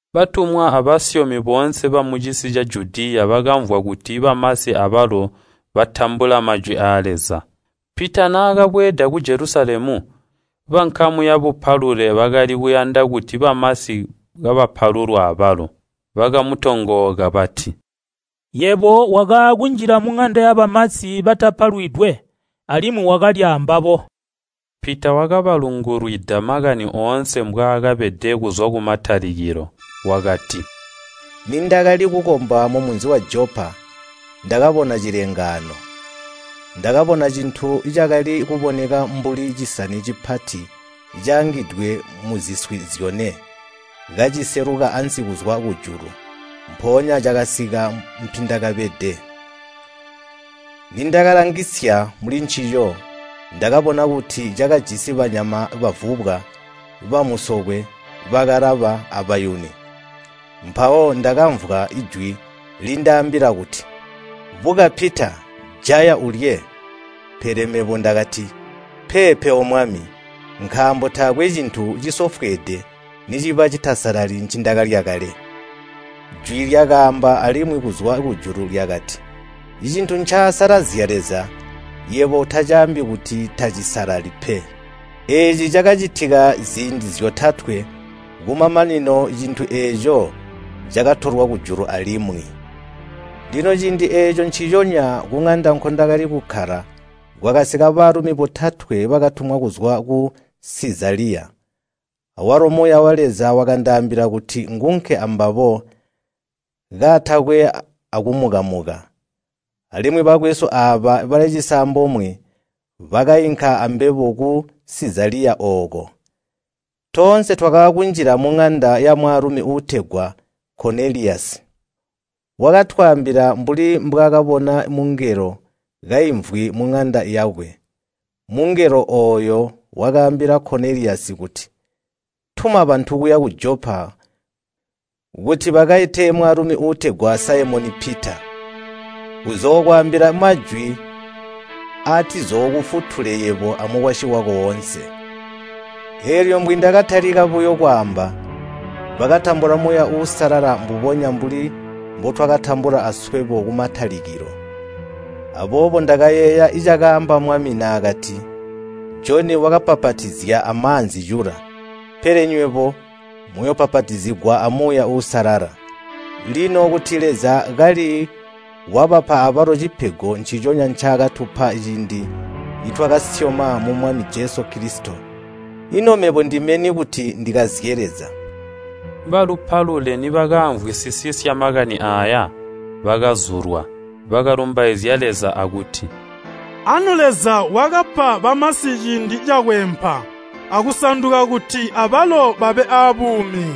Batumwa abasyomi boonse bamucisi ca Judiya bakamvwa kuti bamasi abalo batambula Majwi aa Leza. Pita naakabweeda ku Jelusalemu, bankamu yabupalule bakali kuyanda kuti bamasi kabapalulwa abalo, bakamutongooka. Bati, “Yebo wakaakunjila muŋanda yabamasi batapalwidwe, alimwi wakalya ambabo!” Pita wakabalungulwida makani oonse mbwaakabede, kuzwa kumatalikilo. Wakati, “Nindakali kukomba mumunzi wa Jopa, ndakabona cilengaano. Ndakabona cintu cakali kuboneka mbuli ncisani cipati caangidwe muziswi zyone, kaciseluka ansi kuzwa kujulu, mpoonya cakasika mpindakabede. Nindakalangisya mulincico, ndakabona kuti cakajisi banyama bavubwa, bamusokwe, bakalaba, abayuni. Mpawo ndakamvwa jwi lindaambila kuti, ‘Buka Pita, jaya ulye!’ Pele mebo ndakati, ‘Peepe, O Mwami! Nkaambo taakwe cintu cisofweede niciba citasalali ncindakalya kale.’ Jwi lyakaamba alimwi kuzwa kujulu lyakati, ‘Cintu ncaakasalazya Leza, yebo utacaambi kuti tacisalali pe.’ Eeci cakacitika ziindi zyotatwe, kumamanino cintu eeco cakatolwa kujulu alimwi. Lino ciindi eeco nciconya kuŋanda nkondali kukkala kwakasika baalumi botatwe bakatumwa kuzwa ku Sizaliya. Awalo Muuya wa Leza wakandaambila kuti ngunke ambabo kaatakwe akumuka-muka. Alimwi bakwesu aaba bali cisambomwe bakainka ambebo ku Sizaliya ooko. Toonse twakaakunjila muŋanda yamwaalumi uutegwa Koneliyasi. Wakatwaambila mbuli mbwaakabona mungelo kaimvwi muŋanda yakwe. Mungelo ooyo wakaambila Koneliyasi kuti, ‘Tuma bantu kuya ku Jopa kuti bakaite mwaalumi uutegwa Saimoni Pita. Uzookwaambila majwi aatizookufutule yebo amukwasyi wako oonse.’ Eelyo mbwindakatalika buyo kwaamba, bakatambula Muuya Uusalala mbubonya mbuli mbutwakautambula aswebo kumatalikilo. Aboobo ndakayeeya cakaamba Mwami naakati, ‘Joni wakabbapatizya amaanzi cula, pele nywebo muyoobbapatizigwa a Muuya Uusalala.’ Lino kuti Leza kali wabapa abalo cipego nciconya ncaakatupa ciindi nitwakasyoma mu Mwami Jesu Kilisito, ino mebo ndime ni kuti ndikazye Leza?” Babupalule nibakaamvwisisya makani aaya, bakazulwa. Bakalumbaizya Leza akuti, “Anu Leza wakabapa bamasi ciindi cakweempa akusanduka kuti abalo babe aabuumi.”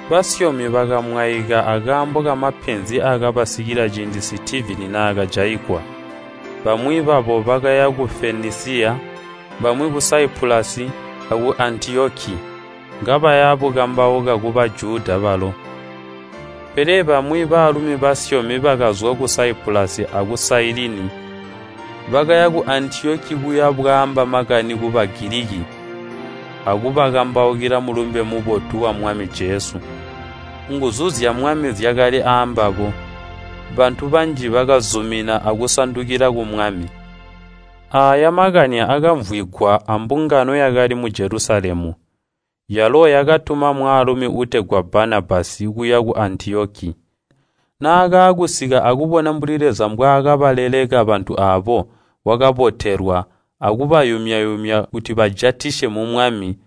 Basyomi bakamwaika akaambo kamapenzi aakabasikila ciindi Sitivini naakajaigwa. Bamwi babo bakaya ku Fenisiya, bamwi ku Saipulasi aku Antiyoki, kabaya bukambauka ku Bajuda balo. Pele bamwi baalumi basyomi bakazwa ku Saipulasi aku Sailini, bakaya ku Antiyoki kuya bwaamba makani ku Bagiliki, kubakambaukila Mulumbe Mubotu wa Mwami Jesu. Nguzu zya Mwami zyakali aambabo, bantu banji bakazumina akusandukila ku Mwami. Aaya makani akamvwigwa ambungano yakali mu Jelusalemu, yalo yakatuma mwaalumi uutegwa Banabasi kuya ku Antiyoki. Naakaakusika akubona mbuli Leza mbwaakabaleleka bantu aabo, wakabotelwa akubayumya-yumya kuti bajatisye mu Mwami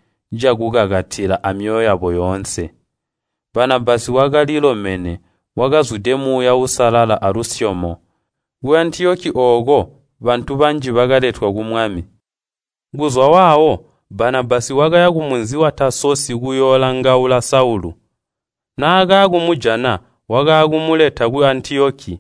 cakukakatila amyoyo yabo yoonse. Banabasi wakalilomene, wakazwide Muuya Uusalala alusyomo. Ku Antiyoki ooko bantu banji bakaletwa ku Mwami. Kuzwa waawo Banabasi wakaya kumunzi wa Taasosi kuyoolangaula Saulu. Naakakumujana, wakaakumuleta ku Antiyoki.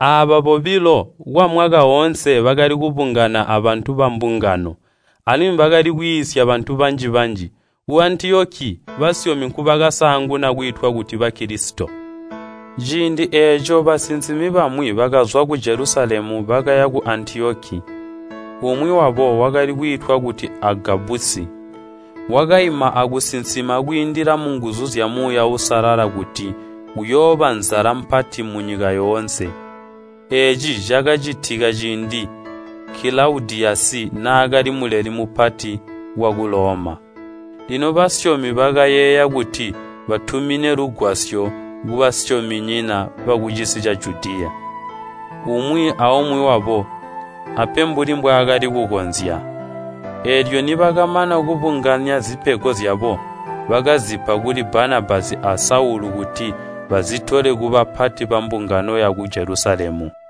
Aaba bobilo kwamwaka oonse bakali kubungana abantu bambungano, alimwi bakali kwiisya bantu banji-banji. Ku Antiyoki basyomi nkubakasaanguna kwiitwa kuti Bakilisito. Ciindi eeco basinsimi bamwi bakazwa ku Jelusalemu bakaya ku Antiyoki. Umwi wabo wakali kwiitwa kuti Agabasi, wakaima akusinsima kwiindila munguzu zya Muuya Uusalala kuti kuyooba nzala mpati munyika yoonse. Eeci cakacitika ciindi Kilaudiyasi naakali Muleli Mupati waku Loma. Lino basyomi bakayeeya kuti batumine lugwasyo kubasyominyina bakucisi ca Judiya, umwi aumwi wabo ape mbuli mbwaakali kukonzya. Eelyo nibakamana kubunganya zipego zyabo, bakazipa kuli Banabasi a Saulu kuti bazitole kubapati bambungano yaku Jelusalemu.